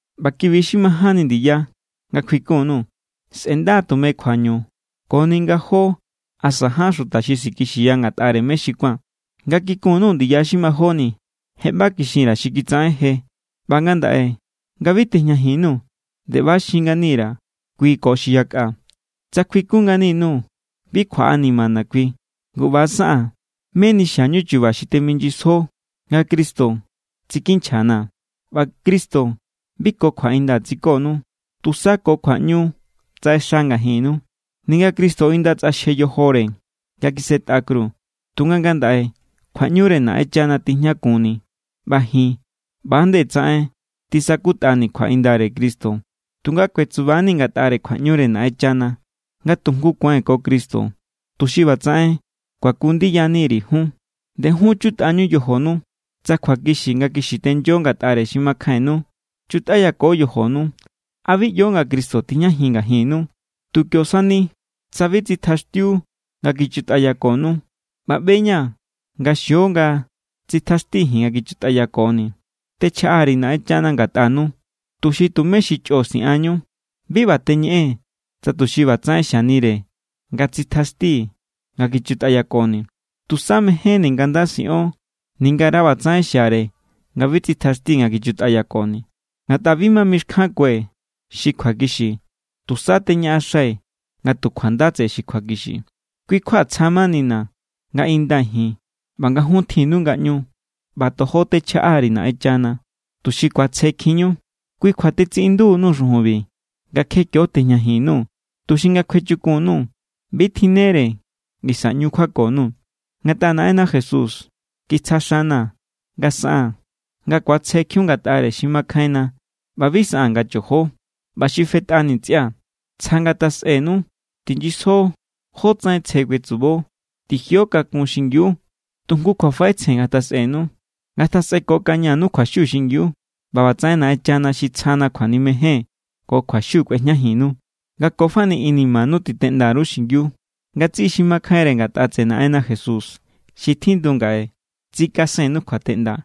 ꞌBa ki=bi xi majánni ndiya nga kjuikun_nuu̱. Sꞌe̱nda= tume kjuañu koni nga jó asa ján xuta xi sikixiya ngatꞌare mé xi kuán. Nga kikun_nuu̱ ndiya xi majóni, je ꞌba kixin_ra̱ xi kitsaꞌen je, ꞌba ngandaꞌe nga bi tejñajin_nuu̱ nde ꞌba= xin ngani_ra̱ kui ko xi yakꞌa: tsa kjuikun ngani_nuu̱, bi kjuaꞌanimana̱ kui. Ngu ꞌba= saꞌaa̱n, meni xiañu chu̱ba̱ xi teminyisjo nga Cristo tsikinchjana̱. ꞌBa Cristo bi ko kjuaꞌinda tsikonu, tusa ko kjuaꞌñu tsaꞌexa ngajinnu. Ninga Cristo inda tsꞌaxje yojore nga kisꞌetꞌa kru, tunga ngandaꞌe kjuaꞌñure Naꞌenchana tijñakunni. ꞌBa ji̱n ꞌba=nde tsaꞌen tisakutꞌani̱ kjuaꞌindare Cristo, tunga kuetsuba=nii̱ ngatꞌare kjuaꞌñure Naꞌenchana nga tu jngu kuai̱n ko Cristo, tuxi ꞌbatsaꞌen kuaku ndiyaniri̱ jun. Ndejun chutꞌañu yojonu, tsa kjuakixi nga kixi tenyo ngatꞌare xi makjainnu. Chutꞌayako yojonu. ¿A bi ꞌyo nga Cristo tijñajin ngajinnu? Tu kio sani tsa bi tsitjaxtjiu nga kichutꞌayakonu. ꞌBa ꞌbe=ña̱ nga xio nga tsitjaxtii̱ ji̱n nga kichutꞌayakoni̱. Techjaꞌa_ri̱ Naꞌenchana ngatꞌanu, tuxi tumé xi chꞌo siꞌanñu. Bi ꞌba teñeꞌee̱n tsa tuxi ꞌbatsaꞌen xianire nga tsitjaxtii̱ nga kichutꞌayakoni̱. Tusa mejénni̱ nga nda siꞌon, ningara ꞌbatsaꞌen xiare nga bi tsitjaxtii̱ nga kichutꞌayakoni̱. Ngatꞌa bi ma mixkjankue̱ xi kjuakixi, tusa teñaꞌaxai̱ nga tu kjuanda tseꞌe xi kjuakixi. Kui kjua tsja= manini̱ nga indai̱ ji̱n ꞌba nga jun tjinnu ngaꞌñu. ꞌBa tojo techjaꞌa_ri̱ Naꞌenchana, tuxi ku̱atsjekjinñu. Kui kjua tetsiꞌindu_nuu̱ xujunbi nga kje kió tejñajin_nuu̱, tuxi nga kjuechukun_nuu̱ bi tjinnere ngisa ꞌñu kjuako_nuu̱. Ngatꞌa Naꞌenna Jesús kitsja xana̱ nga saꞌaa̱n nga ku̱atsjekjiun ngatꞌare xi makjainna ꞌba bi saꞌaa̱n nga chojo. ꞌBa xi fetꞌani ntsꞌia̱, tsja ngatjasꞌenu. Tinyisjo jótsaꞌen tsje kuetsubo. Tijio kakun xingiu. Tu jngu kjuafaꞌetsjen ngatjasꞌenu. Ngatjasꞌekokañanu kjuaxiu xingiu. ꞌBa ꞌbatsaꞌen Naꞌenchana xi tsjana kjuanimejen ko kjuaxiu kꞌuejñajinnu. Nga ko fani inimanu titeꞌnda_ru xingiu. Ngatsiꞌi xi makjainre ngatꞌa tseꞌe Naꞌenna Jesús xi tjindu ngaꞌe tsikasennu kjuateꞌnda.